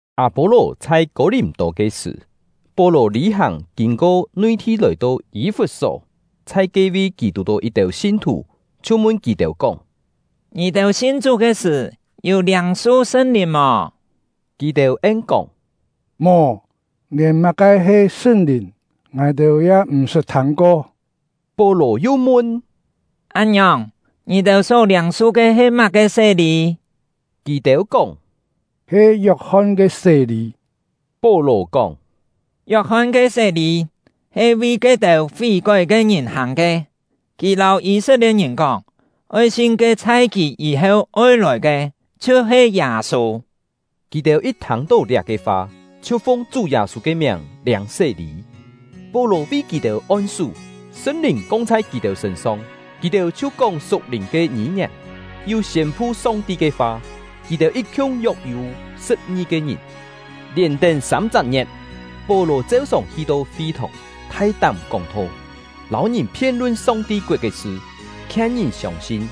Â-pô-lò chhai Kô-lìm-tô ke sṳ̀, Pó-lò lî-hàng kîn-ko nui-thi lòi-to Yî-fut-só. Chhai ke-vi, kì tù-tó yit-têu sin-thù, chhiu mun kì-têu kóng: “Ngì-têu sin Chú ke sṳ̀, yû liâng-su Sṳn-Lìn mò?” Kì-têu en-kóng: “Mò, lièn má-ke he Sṳn-Lìn ngài-têu ya m̀ sṳt thâng-ko.” Pó-lò yu mun: “Án-ngiòng, ngì-têu só liâng ke he má-ke sé-lî?” Kì-têu kóng: “He Yok-hon ke sé-lî.” Pó-lò kóng: “Yok-hon ke sé-lî he vi ke-têu fí-kói ke ngìn hàng ke; kì lâu Yî-set-lie̍t-ngìn kóng, oi sin ke chhai kì yî-heu oi lòi ke, chhiu-he Yâ-sû.” Kì-têu yit thâng-tó liá-ke fa, chhiu fung Chú Yâ-sû ke miàng liâng sé-lî. Pó-lò vi kì-têu on-sú, Sṳn-Lìn kong chhai kì-têu sṳ̂n-song; kì-têu chhiu kóng su̍k-lìn ke ngî-ngièn, yu siên-pu Song-ti ke fa. Kì-têu yit-khiung yok-yû sṳ̍p-ngi-ke ngìn. Lièn-tén sâm-chak ngie̍t, Pó-lò cheu-sòng hi-to fi-thòng, thai-tám kóng-tho, lâu ngìn phien-lun Song-ti koet ke sṳ, khien ngìn siông-sin.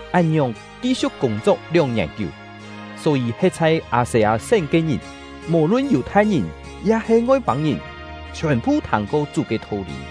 Án-ngiòng ki-siu̍k kûng-chok lióng-ngièn kiú, só-yî he̍t chhai Â-se-â-sén ke ngìn, mò-lun Yù-thai-ngìn ya-he Ngoi-pâng-ngìn, chhiòn-phu thâng-ko Chú ke tho-lî.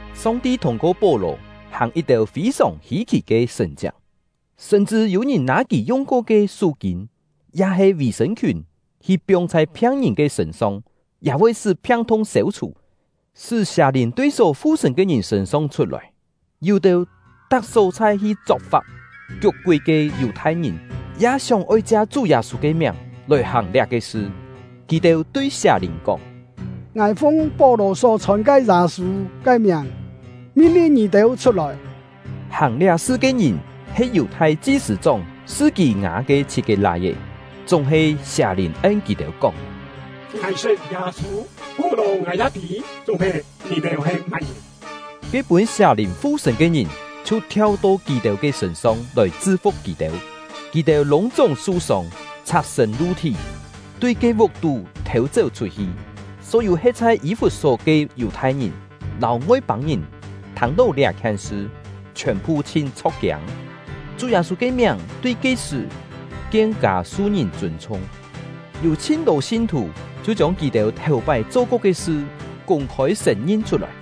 Song-ti thûng-ko Pó-lò hàng yit-têu fî-sòng hî-khì ke sṳ̀n-chiak; sṳm-chṳ yû-ngìn nâ kì yung-ko ke sú-kîn ya-he vì-sṳ̂n-khiùn hi piong chhai phiang-ngìn ke sṳ̂n-song, ya voi sṳ́ phiang-thung sêu-chhù, sṳ́ sià-lìn tui só fu-sṳ̂n ke ngìn sṳ̂n-song chhut-lòi. Yû-têu tak só-chhai hi chok-fap kiuk-kúi ke Yù-thai-ngìn ya sióng-oi chia Chú Yâ-sû ke miàng lòi hàng liá-ke sṳ. Kì-têu tui sià-lìn kóng: “Ngài fung Pó-lò só chhòn ke Yâ-sû ke miàng, min-lin ngì-têu chhut-lòi.” Hàng liá-sṳ ke ngìn he Yù-thai chi-sṳ̂-chóng Sṳ-kî-ngá ke chhit-ke lai-é. Chúng-he, sià-lìn en kì-têu kóng: “Ngài sṳt Yâ-sû, Pó-lò ngài ya tî; chúng-he, ngì-têu he má-ngìn?” Ke pûn sià-lìn fu-sṳ̂n ke ngìn chhiu thiau-to kì-têu ke sṳ̂n-song lòi chṳ-fu̍k kì-têu. Kì-têu lûng-chúng su-sông, chhak-sṳ̂n lu-thí, tui ke vuk-tú thò-chéu chhut-hi. Só-yû he̍t chhai Yî-fut-só ke Yù-thai-ngìn lâu Ngoi-pâng-ngìn thâng-tó liá-khien sṳ, chhiòn-phu chhin chho̍k-kiâng; Chú Yâ-sû ke miàng tui ke-sṳ̀ kien-kâ su-ngìn chûn-chhung. Yû chhin-tô sin-thù chhiu chiông kì-têu thèu-pái cho-ko ke sṳ kûng-khôi sṳ̀n-ngin chhut-lòi.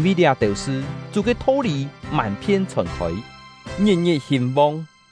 Yîn-vi liá-têu sṳ, Chú ke tho-lî mân-phien chhòn-khôi, ngit-ngit hîn-vong.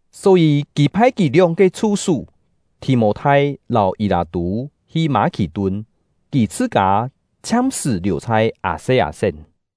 Só-yî kì phai kì lióng-ke chhu-sú Thì-mô-thai lâu Yî-lâ-tû hi Mâ-khì-tun; kì chhṳ-kâ chhiam-sṳ̀ liù chhai Â-se-â-sén.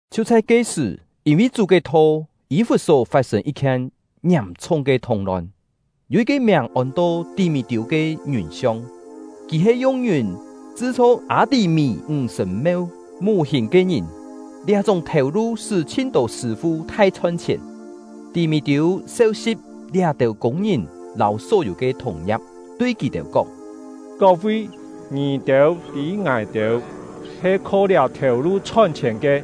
Chhiu chhai ke-sṳ̀, yîn-vi Chú ke Tho, Yî-fut-só fat-sên yit-khien ngiàm-chhung ke thung-lon. Yû yit-ke miàng ôn-to Tí-mí-tiû ke ngiùn-siong, kì he yung ngiùn chṳ-chho Â-tí-mí ńg-sṳ̀n-meu mù-hìn ke ngìn; liá-chúng thèu-lu sṳ́ chhin-tô sṳ̂-fu thai chhon-chhièn. Tí-mí-tiû seu-si̍p liá-têu kûng-ngìn lâu só-yû ke thùng-ngia̍p, tui kì-têu kóng: “Kok-vi, ngì-têu tî ngài-têu he kho liá thèu-lu chhon-chhièn ke.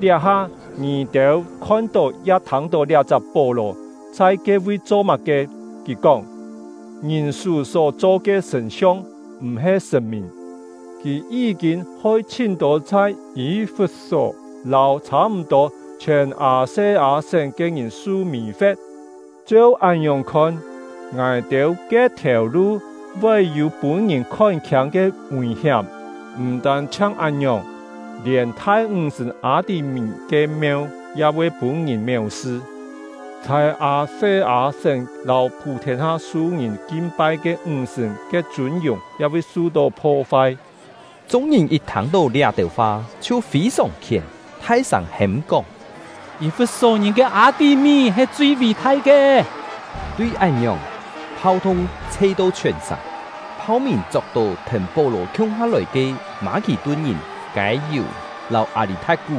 Liá-ha, ngì-têu khon-tó ya thâng-tó liá-chak Pó-lò chhai ke-vi cho má-ke. Kì kóng: ‘Ngìn-sú só-cho ke sṳ̀n-siong m̀-he sṳ̀n-mìn!’ Kì yí-kîn hoi chhin-tô chhai Yî-fut-só lâu chhâ-m̀-tô chhiòn Â-se-â-sén ke ngìn su mì-fe̍t. Cheu án-ngiòng khon, ngài-têu ke thèu-lu voi yû pûn-ngìn khon-khiâng ke ngùi-hiám. M̀ tân-chhiang án-ngiòng, lièn thai ńg-sṳ̀n Â-tí-mí ke meu ya voi pûn-ngìn méu-sṳ, chhai Â-se-â-sén lâu phû-thiên-ha su ngìn kin-pai ke ńg-sṳ̀n ke chûn-yùng ya voi su-tó pho-fai!” Chung-ngìn yit thâng-tó liá-têu fa chhiu fî-sòng khién, thai-sâng hêm-kóng: “Yî-fut-só-ngìn ke Â-tí-mí he chui ví-thai ke!” Tui án-ngiòng, phau-thung chhe-to chhiòn-sàng. Phau-mìn chok-tó thèn Pó-lò khiung-ha lòi ke Mâ-khì-tun-ngìn Kâi-yù lâu Â-lî-tha̍t-kú,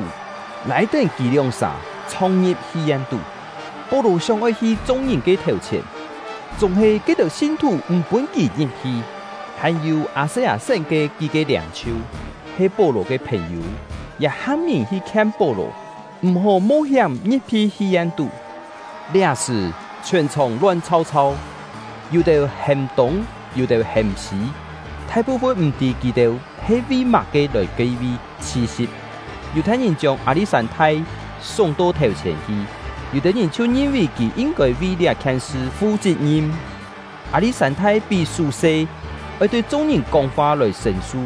lâi-tén kì lióng-sà chhong-ngi̍p hi-yen-tú. Pó-lò sióng-oi hi chung-ngìn ke thèu-chhièn, chúng-he ke-têu sin-thù m̀ pûn kì ngi̍p-hi. Hàn-yû Â-se-â-sén ke kí-ke liâng-chhiu, he Pó-lò ke phèn-yû, ya ham ngìn hi khien Pó-lò, m̀-hó mo-hiám ngi̍p-hi hi-yen-tú. Liá-sṳ̀, chhiòn-chhòng lon chhàu-chhàu, yû-têu hêm tûng, yû-têu hêm sî, thai-phu-fun m̀-tî kì-têu he vi má-ke lòi ke-vi chhi-si̍p. Yù-thai-ngìn chiông Â-li̍t-sân-thai súng-to thèu-chhièn hi, yû-têu ngìn chhiu ngin-vì kì yin-kôi vi liá-khien sṳ fu chit-ngim. Â-li̍t-sân-thai pí sú-se, oi tui chung-ngìn kóng-fa lòi sṳ̂n-su.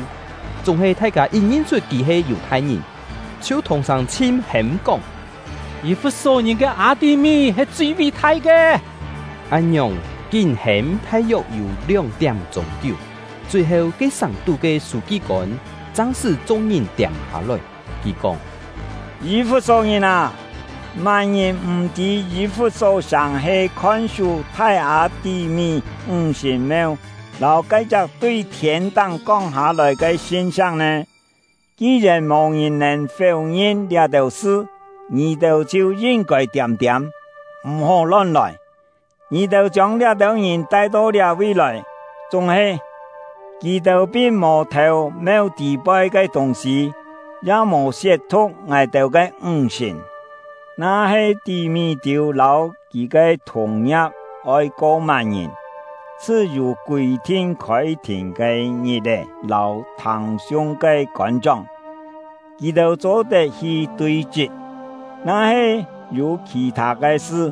Chúng-he, thai-kâ yit ngin-chhut kì he Yù-thai-ngìn, chhiu thùng-sâng chhin hêm kóng: “Yî-fut-só-ngìn ke Â-tí-mí he chui ví-thai ke!” Án-ngiòng kín hêm thai-yok yû lióng-tiám-chûng kiú. Chui-heu, ke sàng-tú ke sû-ki-kôn chang sṳ́ chung-ngìn tiâm-hâ-lòi. Kì kóng: “Yî-fut-só-ngìn â! Má-ngìn m̀-tî Yî-fut-só-sàng he khon-sú thai Â-tí-mí ńg-sṳ̀n-meu lâu ke-chak tui thiên-táng kong hâ-lòi ke sṳn-sa̍k nè! Ki-yèn mò-ngìn nèn féu-ngin liá-têu sṳ, ngì-têu chhiu yin-kôi tiâm-tiâm, m̀-hó lon-lòi. Ngì-têu chiông liá-têu ngìn tai-to liá-vi lòi, chúng-he, kì-têu pin mò thêu meu tî-poi ke tûng-sî, ya mò siet-thu̍k ngài-têu ke ńg-sṳ̀n. Na-he Tí-mí-tiû lâu kì ke thùng-ngia̍p oi ko má-ngìn, chhṳ-yû kûi-thin khôi-thìn ke ngit-è lâu thâng-siung ke kôn-chóng, kì-têu cho-tet hi tui-chṳt. Na-he yû khì-thâ ke sṳ,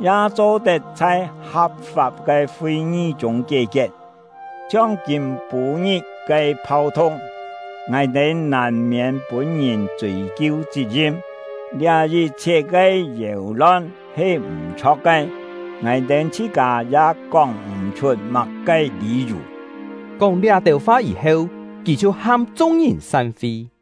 ya cho-tet chhai ha̍p-fap ke fi-ngi chûng kié-kiet. Chhiong kîm-pû-ngit ke phau-thung, ngài-têu nàn-miên voi pûn-ngìn chûi-kiu chit-ngim. Liá yit-chhiet ke yéu-lon he m̀-chho̍k ke, ngài-têu chhṳ-kâ ya kóng m̀-chhut má-ke lî-yù.” Kóng liá-têu fa yî-heu, kì chhiu ham chung-ngìn san-fi.